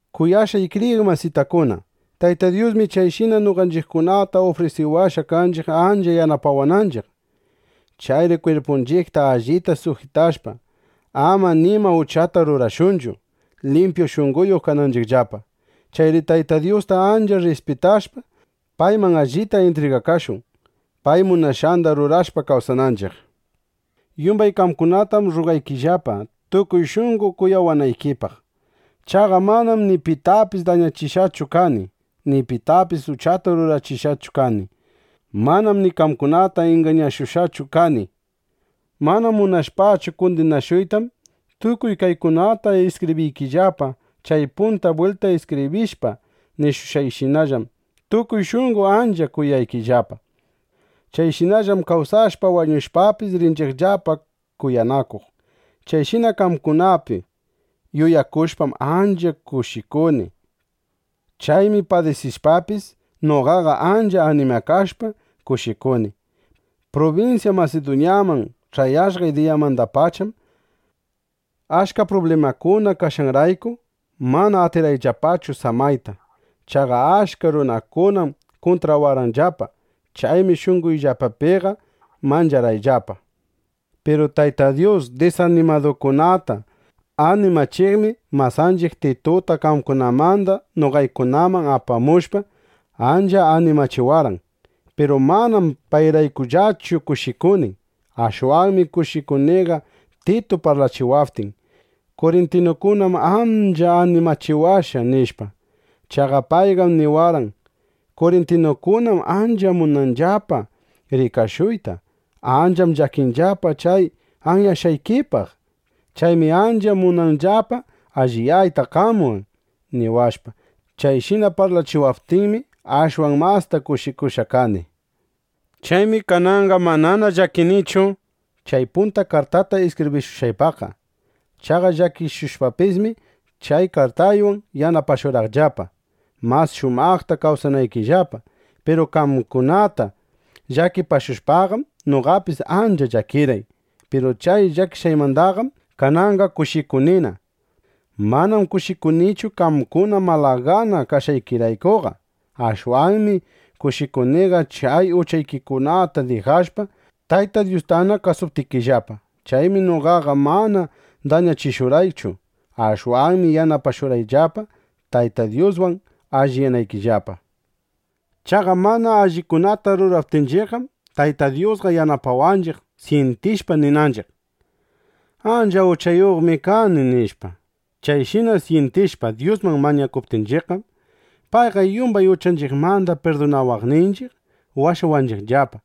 Kuyashqay kriyiq masitakuna, Tayta Dyusmi chayshina noqanchiqkunata ufrisiwashqa kanchiq ancha yanapawananchiq. Chayri kwirpunchiqta allita sujitashpa, ama nima uchata rurashunchu, limpyu shunqoyuq kananchiqllapa. Chayri Tayta Dyusta ancha rrispitashpa, payman allita intrigakashun, pay munashqanda rurashpa kawsananchiq. Yumbay qamkunatam rrugaykillapa, tukuy shunqo kuyawanaykipaq. Chaqa manam ni pitapis dañachishqachu kani, ni pitapis uchata rurachishqachu kani. Manam ni qamkunata ingañashushqachu kani. Mana munashpachu kundinashuytam, tukuy kaykunata iskibriykillapa. Chay punta bwilta iskibrishpa nishushqayshinallam, tukuy shunqo ancha kuyaykillapa. Chayshinallam kawsashpa wañushpapis, rinchiqllapa kuyanakuq. Chayshina qamkunapi yuyakushpam, ancha kushikuni. Chaymi padisishpapis, noqaqa ancha animakashpa, kushikuni. Prubinsya Masiduñaman ch'ayashqay diyamandapacham, achka prublimakuna kashqanrayku, mana atirqayllapachu samayta. Chaqa achka runakunam kuntrawarqanllapa. Chaymi shunqoyllapapiqa mancharqayllapa. Piru Tayta Dyus disanimadukunata animachiqmi masanchiq Tituta qamkunamanda noqaykunaman apamushpa, ancha animachiwarqan. Piru manam payraykullachu kushikuni. Ashwanmi kushikuniqa Titu parlachiwaptin: “Kurintinukunam ancha animachiwashqa”, nishpa. Chaqa payqam niwarqan: “Kurintinukunam ancha munanllapa rikashuyta. Ancham llakinllapa chay anyashqaykipaq. Chaymi ancha munanllapa alliyayta qamwan”, niwashpa. Chayshina parlachiwaptinmi, ashwan masta kushikushqa kani. Chaymi kananqa manana llakinichu chay punta kartata iskibrishushqaypaqqa. (Chaqa llakichishushpapismi, chay kartaywan yanapashurqaqllapa, mas shumaqta kawsanaykillapa.) Piru qamkunata llakichishushpaqam, noqapis ancha llakirqay. Piru chay llakishqaymandaqam kananqa kushikunina. Manam kushikunichu qamkuna malagana kashqaykiraykuqa. Ashwanmi kushikuniqa chay uchaykikunata dijashpa, Tayta Dyustana kasuptikillapa. Chaymi noqaqa mana dañachishurqaqchu. (Ashwanmi yanapashurqaqllapa, Tayta Dyuswan alliyanaykillapa.) Chaqa mana allikunata ruraptinchiqqam, Tayta Dyusqa yanapawanchiq, syintishpa ninanchiq: Ancha uchayuqmi kani, nishpa. Chayshina syintishpa Dyusman mañakuptinchiqqam, payqa yumban uchanchiqmanda pirdunawaqninchiq, washawanchiqllapa.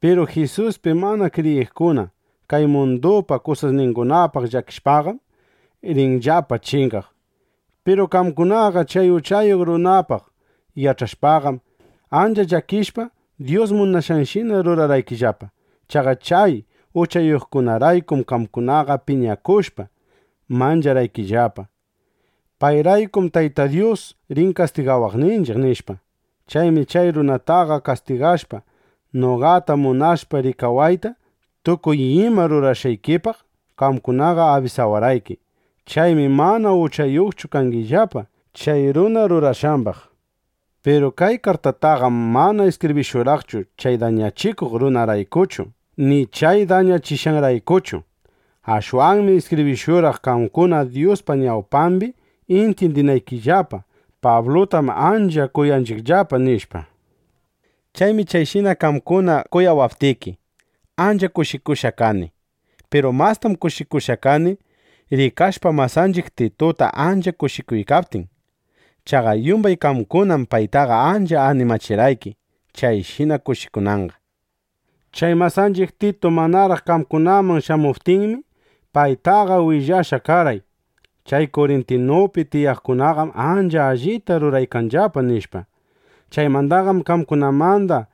Piru Jisuspi mana kriyiqkuna kay mundupa kusasningunapaq llakishpaqam, rinllapa chingaq. Piru qamkunaqa chay uchayuq runapaq yach'ashpaqam, ancha llakishpa, Dyus munashqanshina rurarqaykillapa. Chaqa chay uchayuqraykum qamkunaqa piñakushpa, mancharqaykillapa: Payraykum Tayta Dyus rin kastigawaqninchiq, nishpa. Chaymi chay runataqa kastigashpa, noqata munashpa rikawayta, tukuy ima rurashqaykipaq qamkunaqa abisawarqayki. Chaymi mana uchayuqchu kangillapa chay runa rurashqambaq. Piru kay kartataqam mana iskibrishurqaqchu chay dañachikuq runaraykuchu, ni chay dañachishqanraykuchu. Ashwanmi iskibrishurqaq, qamkuna Dyuspa ñawpambi intyindinaykillapa: Pablutam ancha kuyanchiqllapa, nishpa. Chaymi chayshina qamkuna kuyawaptiki, ancha kushikushqa kani. Piru mastam kushikushqa kani, rikashpa masanchiq Tituta ancha kushikuykaptin. Chaqa yumbay qamkunam paytaqa ancha animachirqayki, chayshina kushikunanqa. Chay masanchiq Titu manaraq qamkunaman shamuptinmi, paytaqa willashqa karqay: “Chay Kurintupi tiyaqkunaqam ancha allita ruraykanllapa”, nishpa. Chaymandaqam qamkunamanda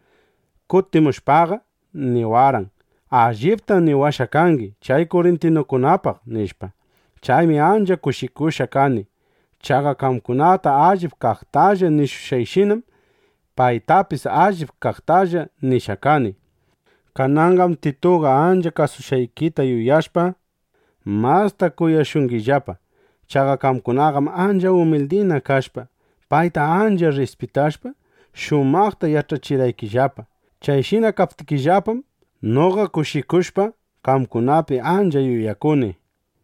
kutimushpaqa, niwarqan: “Alliptam niwashqa kangi chay kurintinukunapaq”, nishpa. Chaymi ancha kushikushqa kani. Chaqa qamkunata allip kaqtalla nishushqayshinam, paytapis allip kaqtalla nishqa kani. Kananqam Tituqa ancha kasushqaykita yuyashpa, masta kuyashungillapa. Chaqa qamkunaqam ancha umildina kashpa, payta ancha rrispitashpa, shumaqta ch'ayachirqaykillapa. Chayshina kaptikillapam, noqa kushikushpa, qamkunapi ancha yuyakuni.